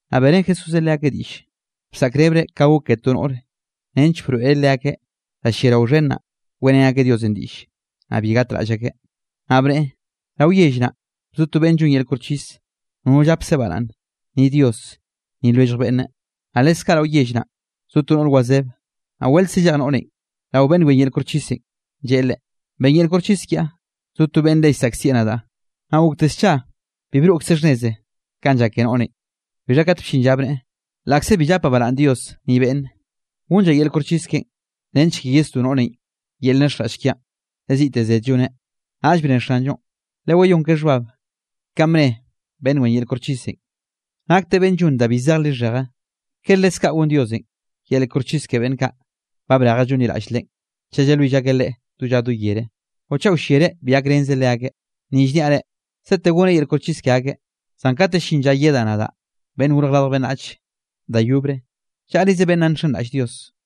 Naꞌ beꞌrén Jesúsenꞌ leakeꞌ diꞌll, bsaꞌkrebreꞌ ka gok ke to noꞌr, nench broeꞌreꞌ leakeꞌ da lliarao xhen naꞌ, weꞌrén akeꞌ Diosenꞌ diꞌll, naꞌ bi gatraꞌll akeꞌ. Naꞌ bneꞌe: —Rao yell naꞌ bzo to beꞌnn llon yel koxchis, nono llapkzeꞌ baraꞌnne, ni Dios, ni lwellj beꞌnne. Naꞌ leskaꞌ rao yell naꞌ zo to noꞌr wazeb, naꞌ weltze llej noꞌrenꞌ rao beꞌnn wen yel koxchisenꞌ, lleꞌe leꞌe: “Ben yel koxchis kiaꞌ, zo to beꞌnn le llsaꞌkzieꞌ nadaꞌ.” Naꞌ gokte scha, bi broꞌkzeꞌ xhnneze kanꞌ llak ke noꞌrenꞌ. Bixha kate bllin lla bneꞌe: “Laꞌkze bi llapaꞌ baraꞌnne Dios ni beꞌnne, gonllaꞌ yel koxchis keꞌen, nench ke yesdó noꞌrenꞌ yel llxhenraꞌll kiaꞌn, le ziꞌte zed lloneꞌ.” Naꞌll bne Xanllonꞌ: —Lewayón ke xhbab kanꞌ bne beꞌnn wen yel koxchisenꞌ, nakteꞌ beꞌnn llon da bi zej lixheje. ¿Kere leskaꞌ gon Diosenꞌ yel koxchis ke beꞌnn kaꞌ ba brejeꞌ llonliraꞌll Leꞌen, chaꞌ llalwill akeꞌ Leꞌe do lla do yere? ¿O chaꞌ wllereꞌ bi gakrenzeꞌ leakeꞌ? Ni llniaꞌ reꞌ, sete goneꞌ yel koxchis ke akeꞌ. Zan katenꞌ llin lla yedaꞌ nadaꞌ, Beꞌnn Gorj Radj Beꞌnnach, da yobre, ¿llaꞌrize beꞌnn nna nxenraꞌll Dios?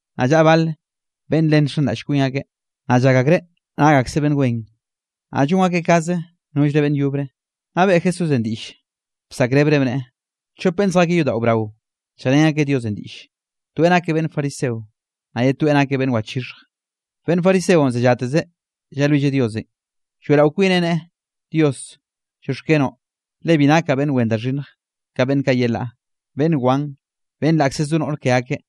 Naꞌ llaꞌa bal beꞌnn le nxenraꞌll kwin akeꞌ, naꞌ llak akreꞌ nak akseꞌ beꞌnn wen, naꞌ llon akeꞌ kaze nollre beꞌnn yobre, naꞌ beꞌe Jesúsenꞌ diꞌll bsaꞌkrebreꞌ bneꞌe: —Chop beꞌnn zjakeꞌ yodaꞌo brao, lljeꞌrén akeꞌ Diosenꞌ diꞌlle, toeꞌ nakeꞌ beꞌnn fariseo, naꞌ ye toeꞌ nakeꞌ beꞌnn wachixhj. Beꞌnn fariseonꞌ zellatezeꞌ llalwilleꞌ Diosenꞌ, lloeꞌrao kwineꞌ neꞌe: “Dios, llioxkenoꞌ, le bi nakaꞌ beꞌnn wen da xhinnj, ka beꞌnn kaꞌ yelaꞌ, beꞌnn wan, beꞌnn laꞌkze zo noꞌr ke akeꞌ,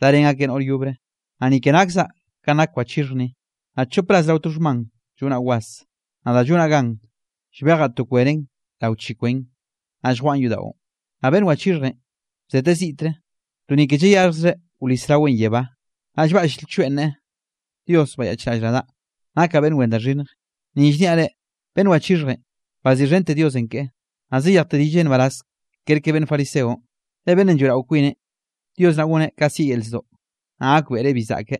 darén akeꞌ noꞌr yobre, naꞌ ni ke nakzaꞌ kanꞌ nak wachixhj ni. Naꞌ chop ras rao to xhman llonaꞌ was, naꞌ da llonaꞌ gan, llbejaꞌ to kwenen rao chi kwen, naꞌ lljwaꞌan yodaꞌon.” Naꞌ beꞌnn wachixhjenꞌ bzeteꞌ ziꞌtre, to ni ke llayaxhjzreꞌ wlis raweꞌ yebá, naꞌ llbaꞌll lchoeꞌ neꞌe: “¡Dios bayaꞌchraꞌll nadaꞌ, nakaꞌ beꞌnn wen da xhinnj!” Ni llniaꞌ reꞌ, beꞌnn wachixhjenꞌ, baziꞌxhente Diosenꞌ keꞌe, naꞌ zayejteꞌ rilleꞌ nbaraz kerke beꞌnn fariseonꞌ. Le beꞌnnenꞌ lloeꞌrao kwineꞌ, Diosenꞌ goneꞌ ka sieꞌ yel zdoꞌ, naꞌ gakbeꞌreꞌ bi zaꞌke,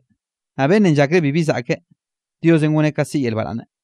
naꞌ beꞌnnenꞌ llakreꞌ bibi zaꞌke, Diosenꞌ goneꞌ ka sieꞌ yel baraꞌnne.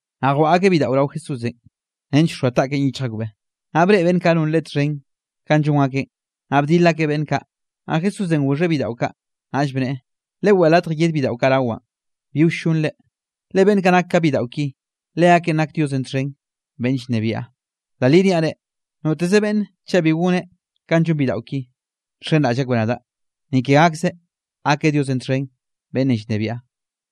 Naꞌ jwaꞌa akeꞌ bidaꞌo rao Jesúsenꞌ nench wxoa taꞌkeꞌn yichj akbeꞌ. Naꞌ breꞌe beꞌnn kaꞌ non Leꞌe txhen kanꞌ llon akeꞌn, naꞌ bdil akeꞌ beꞌnn kaꞌ. Naꞌ Jesúsenꞌ goxheꞌ bidaꞌo kaꞌ, naꞌll bneꞌe: —Leweꞌe latj yed bidaꞌo kaꞌ rawaꞌn, bi wllonre, le beꞌnn kaꞌ nak ka bidaꞌo ki, leakeꞌn nak Diosenꞌ txhen beꞌnn llnebiaꞌ. Da li niaꞌ reꞌ, noteze beꞌnne chaꞌ bi goneꞌ ka llon bidaꞌo ki nxenraꞌll akbeꞌ nadaꞌ, ni ke gakzeꞌ gakeꞌ Diosenꞌ txhen beꞌnnenꞌ llnebiaꞌ.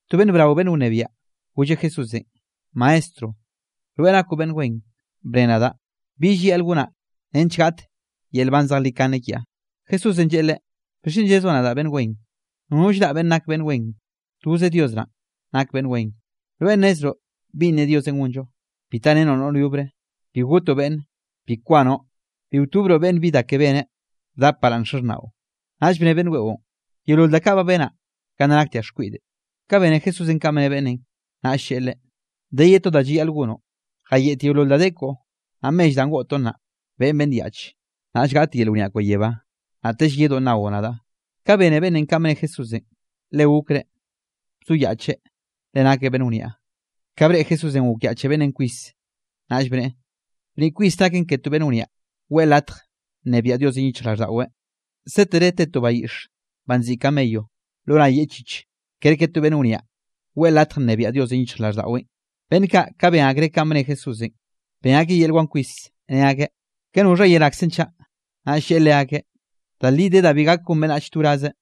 To beꞌnn brao beꞌnn wniaꞌ, golleꞌ Jesúsenꞌ: —Maestro, rweꞌ nakoꞌ beꞌnn wen; bne nadaꞌ, ¿bi llayaꞌl gonaꞌ nench gaꞌt yel nban zejlikane kiaꞌ? Jesúsenꞌ lleꞌe leꞌe: —¿Bixchen llezoꞌ nadaꞌ beꞌnn wen? Nono llraꞌ beꞌnn nak beꞌnn wen, toze Dios naꞌn nak beꞌnn wen. Rweꞌ nnezroꞌ binꞌ ne Diosenꞌ gonllo: “Bi tarenoꞌ noꞌr yobre, bi gotoꞌ beꞌnne, bi kwanoꞌ, bi wtobroꞌ beꞌnn bi da ke beneꞌ, bdap baraꞌnn xaxhnaꞌo.” Naꞌll bne beꞌnn weꞌon: —Yeolol da kaꞌ ba benaꞌ ka nna naktiaꞌ xkwiꞌde. Ka bene Jesúsenꞌ kanꞌ bne beꞌnnenꞌ, naꞌll lleꞌe leꞌe: —De ye to da llayaꞌl gonoꞌ, jayeꞌt yeolol da de koꞌo, naꞌ mell danꞌ goꞌtoꞌn naꞌ, beꞌen beꞌnn yaꞌch, naꞌll gaꞌt yel wniaꞌ koꞌo yebá, naꞌtell yedoꞌ nnaoꞌ nadaꞌ. Ka bene beꞌnnenꞌ kanꞌ bne Jesúsenꞌ, le gokreꞌ, bzoyaꞌcheꞌ le nakeꞌ beꞌnn wniaꞌ. Ka breꞌe Jesúsenꞌ gokyaꞌche beꞌnnenꞌ kwis, naꞌll bneꞌe: —¡Bniꞌ kwis naken ke to beꞌnn wniaꞌ, weꞌe latj nnebiaꞌ Diosenꞌ yichjraꞌlldaꞌweꞌ! Sétere te to bayiꞌxe banꞌ nziꞌi camello lo nay yeꞌchich, kerke to beꞌnn wniaꞌ weꞌe latj nnebiaꞌ Diosenꞌ yichjraꞌlldaꞌweꞌn. Beꞌnn kaꞌ ka ben akreꞌ kanꞌ bne Jesúsenꞌ, ben akeꞌ yel wan kwis, ne akeꞌ: —¿Ka noxha yerakzenꞌ chaꞌ? Naꞌll lleꞌe leakeꞌ: —Da li de da bi gak gon beꞌnnachenꞌ to wrazeꞌ,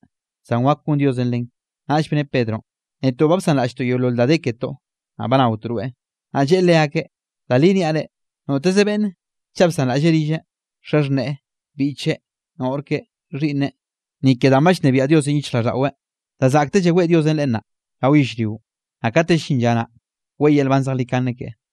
zan wak gon Diosenꞌ len. Naꞌll bne Pedronꞌ: —Netoꞌ ba bsanraꞌlltoꞌ yeolol da de ketoꞌ, naꞌ ba naotoꞌ rweꞌ. Naꞌ lleꞌe leakeꞌ: —Da li niaꞌ reꞌ, noteze beꞌnne, chaꞌ bsanraꞌlleꞌ rilleꞌ, xaxhneꞌe, biꞌcheꞌ, noꞌr keꞌe, xhiꞌnneꞌ, ni ke danꞌ ba llnebiaꞌ Diosenꞌ yichjraꞌlldaꞌweꞌ, da zaꞌktell weꞌe Diosenꞌ leꞌe nnaꞌ, rao yellrionꞌ, naꞌ kate llin lla naꞌ, weꞌe yel nban zejlikane keꞌe.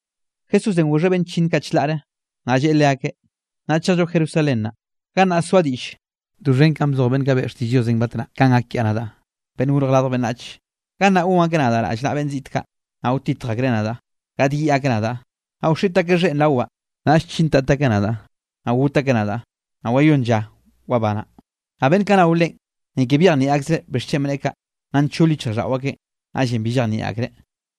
Jesúsenꞌ goxheꞌ beꞌnn chllinn kaꞌ chlaꞌre, naꞌ lleꞌe leakeꞌ: —Naꞌ chejllo Jerusalén naꞌ, gannaꞌ soaꞌ diꞌll doxhen kanꞌ bzoj beꞌnn kaꞌ beꞌe xtiꞌll Diosenꞌ batnaꞌ kanꞌ gak kiaꞌ nadaꞌ, Beꞌnn Gorj Radj Beꞌnnach. Gannaꞌ gon akeꞌ nadaꞌ rallnaꞌa beꞌnn ziꞌt kaꞌ, naꞌ wtitj akreꞌ nadaꞌ, gaꞌdyiꞌ akeꞌ nadaꞌ, naꞌ wxiꞌt akeꞌ xheꞌn rawaꞌ. Naꞌll chintat akeꞌ nadaꞌ, naꞌ got akeꞌ nadaꞌ, naꞌ wayónn lla wabanaꞌ. Naꞌ beꞌnn kaꞌ nao Leꞌen, ni ke byejnieꞌ akzreꞌ bixchen bneꞌe kaꞌ, nna nchol yichjraꞌlldaꞌo akeꞌn, naꞌllenꞌ bi llejnieꞌ akreꞌ.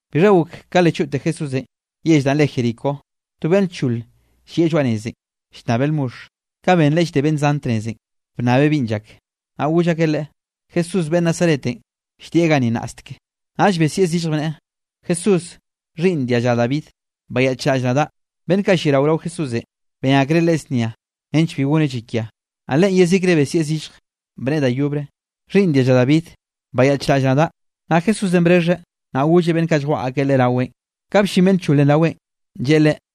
Bixha gok ka le choꞌte Jesúsenꞌ yell danꞌ re Jericó, to beꞌnn lchol llieꞌ lloaꞌ nezenꞌ, llnnabeꞌ lmoxh. Ka benreꞌ llde beꞌnn zan tnezenꞌ, bnnabeꞌ binꞌ llak. Naꞌ goll akeꞌ leꞌe: —Jesús beꞌnn Nazaretenꞌ lldieꞌ ganni nnaꞌsteke. Naꞌll besieꞌ zillj, bneꞌe: —¡Jesús, Xhiꞌnn dia lla David, bayaꞌchraꞌll nadaꞌ! Beꞌnn kaꞌ lliarao rao Jesúsenꞌ, ben akreꞌ leꞌe znia nench bi goneꞌ llakia, naꞌ leꞌen yezikre besieꞌ zillj, bneꞌe da yobre: —¡Xhiꞌnn dia lla David, bayaꞌchraꞌll nadaꞌ! Naꞌ Jesúsenꞌ brexheꞌ, naꞌ golleꞌ beꞌnn kaꞌ lljwaꞌa akeꞌ leꞌe raweꞌn. Ka bllin beꞌnn lcholenꞌ raweꞌn, lleꞌe leꞌe: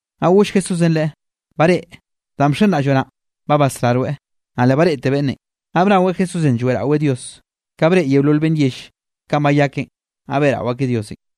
Naꞌ goll Jesúsenꞌ leꞌe: —Bareꞌe, danꞌ bxenraꞌlloꞌ naꞌn, ba basrá rweꞌ. Naꞌ le bareꞌte beꞌnnenꞌ, naꞌ bnaweꞌ Jesúsenꞌ lloeꞌraweꞌ Dios. Ka breꞌe yeolol beꞌnn yell kanꞌ bayakeꞌn, naꞌ beꞌrao akeꞌ Diosenꞌ.